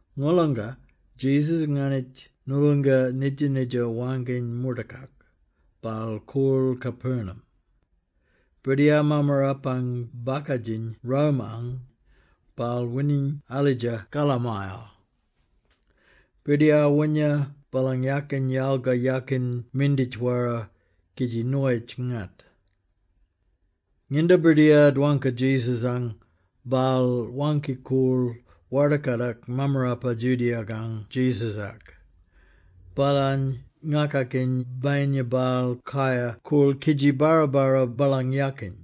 Ngolanga Jesus nganitj noolonga nidja-nidja waangkiny moortakak, baal koorl Capernaum. Birdiyar mammarapang bakadjiny Rome-ang, baal wining alidja kalamayal. Birdiyar woonya baalang yakin yalga yakin minditj-wara kidji noyitj-ngat. Nginda birdiyar dwangka Jesus-ang, baal waangki-koorl warda-kadak mammarapa Judea-kang Jesus-ak, baalany ngakakiny bayinya baal kayar koorl kidji barra-barra baalang yakin.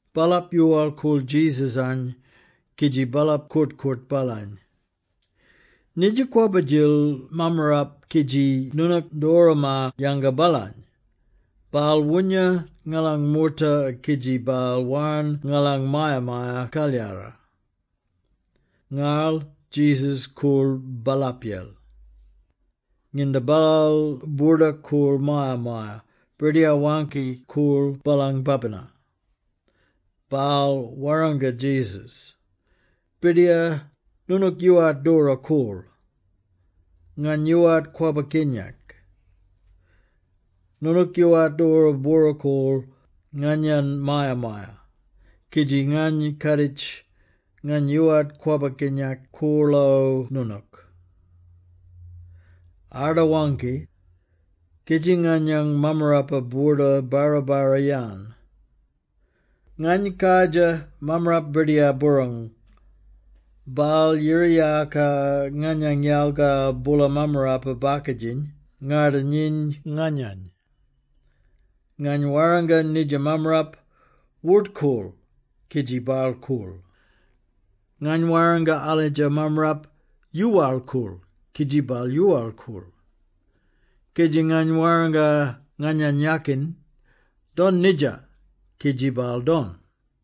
Baalap yoowal-koorl Jesus-any kidji baalap koort-koort baalany, “Nidja kwabba-djil mammarap kidji noonook doora maar-yanga baalany. Baal woonya ngalang moorta kidji baal warn ngalang Maya-maya-Kalyara.” Ngarl Jesus koorl baalapyel. Nginda baal boordak-koorl maya-maya, birdiyar waangki-koorl baalang babina. Baal warranga Jesus, “Birdiyar, noonook yoowart doora koorl. Ngany yoowart kwabba-kinyak. Noonook yoowart doora bwora-koorl nganyang maya-maya, kidji ngany kaaditj, ngany yoowart kwabba-kinyak koorlo noonook. Arda waangki, kidji nganyang mammarap boorda-barra-barra-yan. Ngany kardjir mammarap birdiyar-boorong. Baal yira-yaaka nganyang yalga boola mammarapa-bakadjiny ngarda-nyiny nganyany. Ngany warranga nidja mammarap, ‘Wort-koorl!’ kidji baal koorl. Ngany warranga alidja mammarap, ‘Yoowal-koorl!’ kidji baal yoowal-koorl. Kidji ngany warranga nganyang yakin, ‘Don nidja!’ Kidji baal don.”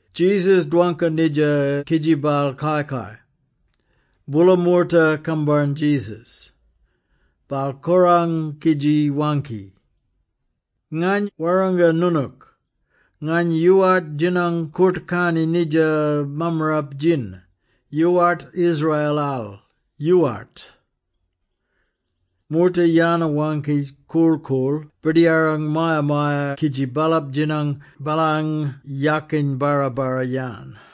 Jesus dwangka nidja kidji baal kai-kai. Boola moorta kambarn Jesus. Baal korang kidji waangki, “Ngany warranga noonook, ngany yoowart djinang koort-karni nidja mammarap-djin, yoowart Israel-al, yoowart!” Moorta yana-waangki korl-koorl birdiyarang maya-maya kidji baalap djinang baalang yakin barra-barra-yan.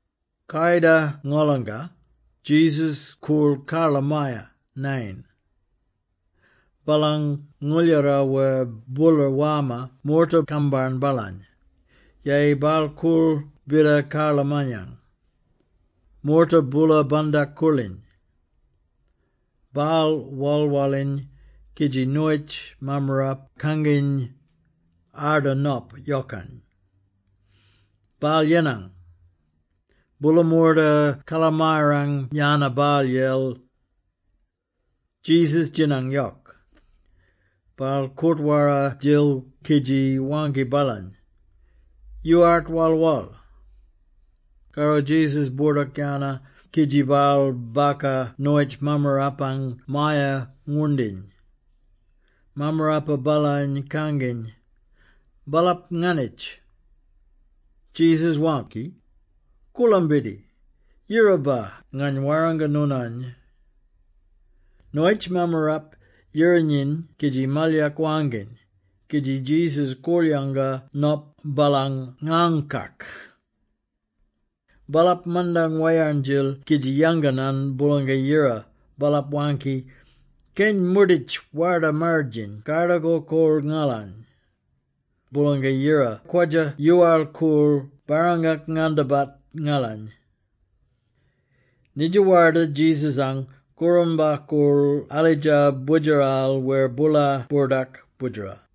Kayida ngolanga, Jesus koorl karlamaya, Nain. Baalang ngooldjara wer boola warma moorta kambarn baalany. Yeyi baal koorl bida karlamayang. Moorta boola bandak-koorliny. Baal wal-waliny kidji noyitj mammarap kanginy, arda nop yokang. Baal yenang. Boola moorta karlamayang yana baalyel. Jesus djinang yok. Baal koort-wara-djil kidji waangki baalany, “Yoowart wal-wal.” Karro Jesus boordak-yana kidji baal baka noyitj mammarapang maya-ngwoorndiny. Mammarapa baalany kanginy, baalap nganitj. Jesus waangki, “Koolambidi! Yiraba, ngany warranga noonany!” Noyitj mammarap yira-nyiny kidji malyak waangkiny, kidji Jesus korl-yanga nop baalang ngaangkak. Baalap mandang wayarn-djil kidji yanganan Boolanga-Yira. Baalap waangki, “Keny moorditj Warda-Marridjiny kardakor-koorl ngalany! Boolanga-Yira kwadja-yoowal-koorl barrangak-ngandabat ngalany!” Nidja warda Jesus-ang kooramba-koorl alidja boodjeral wer boola boordak boodjera.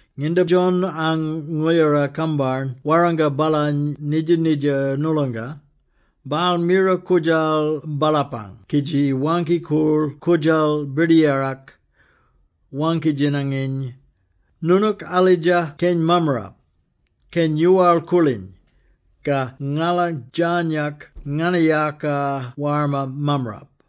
Nginda John-ang ngooldjara-kambarn warranga baalany nidja-nidja noolonga, baal mira koodjal baalapang kidji waangki-koorl koodjal Birdiyarak, waangki-djinanginy, “Noonook alidja Keny Mammarap, Keny yoowal-koorliny. Ka ngala djarnyak nganayaka warma mammarap?”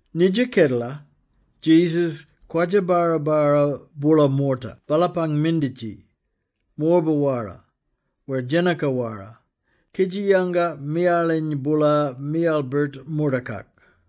Nidja kedela, Jesus kwadja-barra-barra boola moorta baalapang minditji, morba-wara wer djenaka-wara, kidji yanga miyaliny boola miyal-birt moortakak.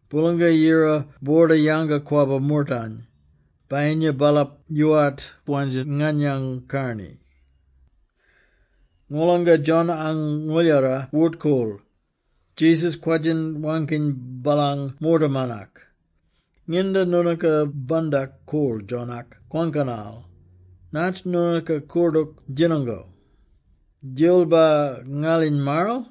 Boolanga-Yira boorda yanga-kwabba moortany, bayinya baalap yoowart wandja nganyang karni.” Ngolanga John-ang ngooldjara wort-koorl, Jesus kwadjin waangkiny baalang moortaman-ak, “Nginda noonooka bandak-koorl John-ak kwangkanal, natj noonooka koordook djinango? Djilbar ngaliny marral?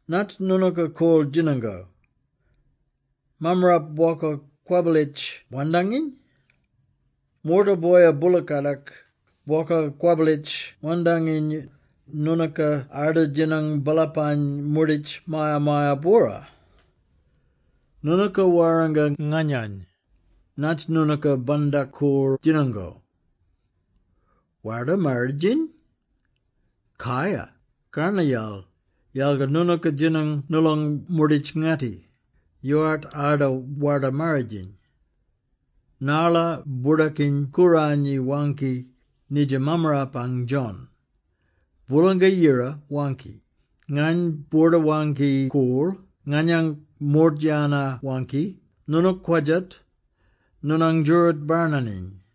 Natj noonooka koorl djinango? Mammarap bwoka kwabbalitj wandanginy? Moorta boya boola-kadak, bwoka kwabbalitj wandanginy, noonooka arda djinang baalapany moorditj maya-maya-bwora! “Noonooka warranga nganyany, natj noonooka bandak-koorl djinango? Warda-Marridjiny? Kaya, karnayal, yalga noonooka djinang noolong moorditj-ngatti, yoowart arda Warda-Marridjiny. Narla Boordakiny-Kooranyi waangki nidja mammarapang, John, ‘Boolanga-Yira waangki, “Ngany boorda-waangki-koorl nganyang moort yana-waangki noonook-kwadjat, noonang djooroot barnaniny.”’”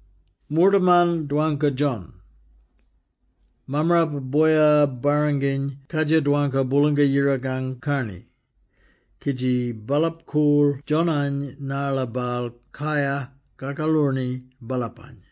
Moortaman dwangka John; mammarapa boya-barranginy kadjir dwangka Boolanga-Yirakang karni, kidji baalap koorl John-any narla baal kayar kakaloorni baalapany.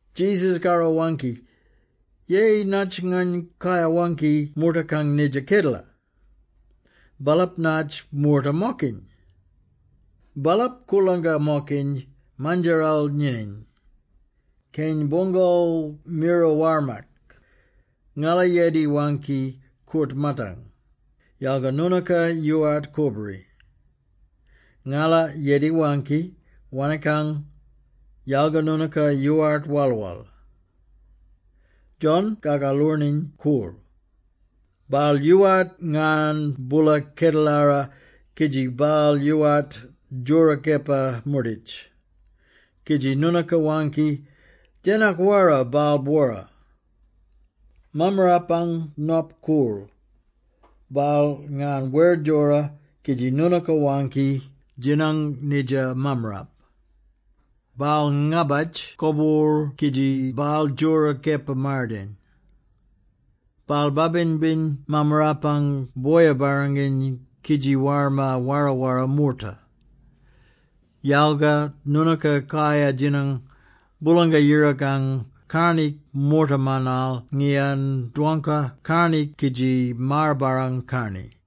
Jesus karro-waangki, “Yeyi natj ngany kayar-waangki moortakang nidja kedela? Baalap natj moorta-mokiny? Baalap koorlangka-mokiny mandjaral nyinyiny. Keny boongal mira warmak, ‘Ngala yedi-waangki koort-maatang, yalga noonooka yoowart kobori! Ngala yedi-waangki wanikang, yalga noonooka yoowart wal-wal!’ John-Kakaloorniny koorl. Baal yoowart ngarn boola kedelara kidji baal yoowart djora kepa-moorditj, kidji noonooka waangki, ‘Djenak-wara baal-bwora!’ Mammarapang Nop koorl, baal ngarn wer djora, kidji noonooka waangki, ‘Djinang nidja mammarap! Baal ngabatj koboorl kidji baal djora kepa-mardayin. Baal babin-biny mammarapang boya-barranginy kidji warma wara-wara moorta’ Yalga noonooka kayar djinang Boolanga-Yirakang karni moortamanal ngiyan dwangka karni kidji maar-barrang karni.”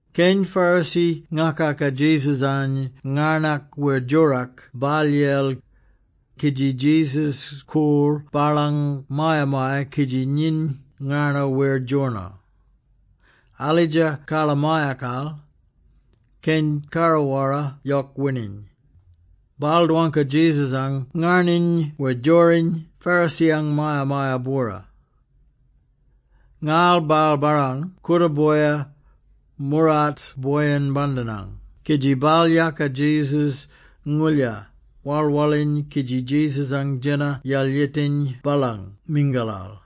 Keny Pharisee ngakaka Jesus-any ngarnak wer djorak baalyel, kidji Jesus koorl baalang maya-maya kidji nyiny ngarno wer djorno. Alidja karlamayakal, keny karra-wara yok wining. Baal dwangka Jesus-ang ngarniny wer djoriny Pharisee-ang maya-maya-bwora. Ngarl baal barrang kooda-boya, moorart boyin-bandinang kidji baal yaaka Jesus-ngoolya, wal-waliny kidji Jesus-ang djena yalyetiny baalang mingalal.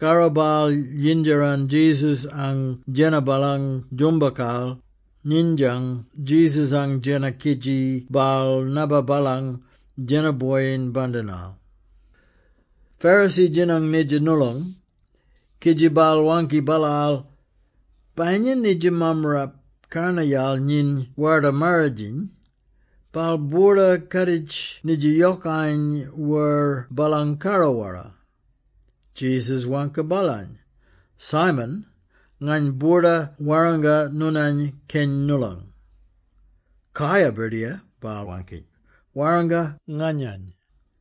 Karro baal yindjaran Jesus-ang djena baalang djoombakal, nindyan Jesus-ang djena kidji baal nabba baalang djena boyin-bandinal. Pharisee djinang nidja noolong, kidji baal waangki baalaal, “Bayinya nidja mammarap karnayal nyiny Warda-Marridjiny, baal boorda kaaditj nidja yokany wer baalang karra-wara!” Jesus waangki baalany, “Simon, ngany boorda warranga noonany keny noolong.” “Kaya, Birdiyar,” baal waangki, “Warranga nganyany.”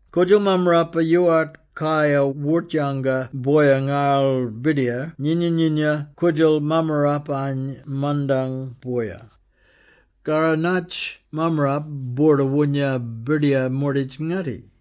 Koodjal mammarapa yoowart kayar wort-yanga boya ngarl birdiyar nyina-nyina koodjal mammarapany mandang boya. Karro natj mammarap boorda woonya birdiyar moorditj-ngatti?”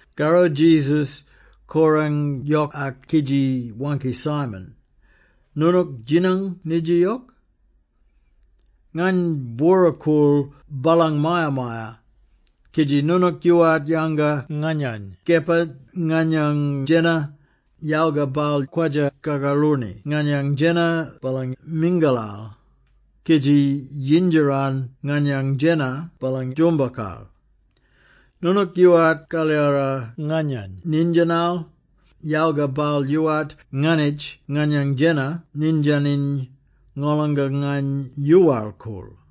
Karro Jesus korang yokak kidji waangki Simon, “Noonook djinang nidja yok? Ngany bwora-koorl baalang maya-maya, kidji noonook yoowart yanga nganyany kepa nganyang djena, yalga baal kwadja-kakaloorni nganyang djena baalang mingalal, kidji yindjaran nganyang djena baalang djoombakal. Noonook yoowart kalyara nganyany nindyanal, yalga baal yoowart nganitj nganyang djena nindyaniny ngolonga ngany yoowal-koorl.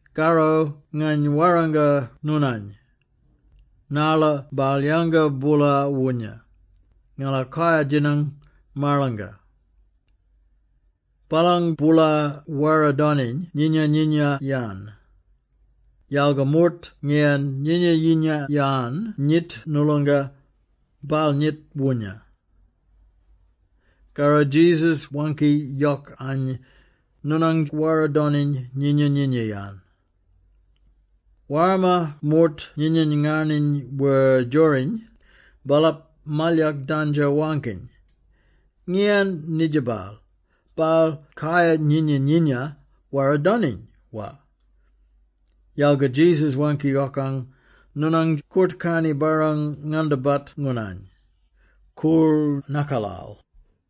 Karro ngany warranga noonany, narla baal yanga boola woonya, ngala kayar-djinang marlanga. Baalang boola wara-doniny nyinya-nyinya-yan. Yalga moort ngiyan nyinya-nyinya-yan nyit noolonga, baal nyit woonya.” Karro Jesus waangki yokany, “Noonang wara-doniny nyinya-nyinya-yan.” Warma moorta nyinyiny ngarniny wer djoriny, baalap malyak dandjo-waangkiny, “Ngiyan nidja baal? Baal kayar-nyinya-nyinya wara-doniny, wa?” Yalga Jesus waangki yokany, “Noonang koort-karni barrang-ngandabat noonany. Koorl nakalal.”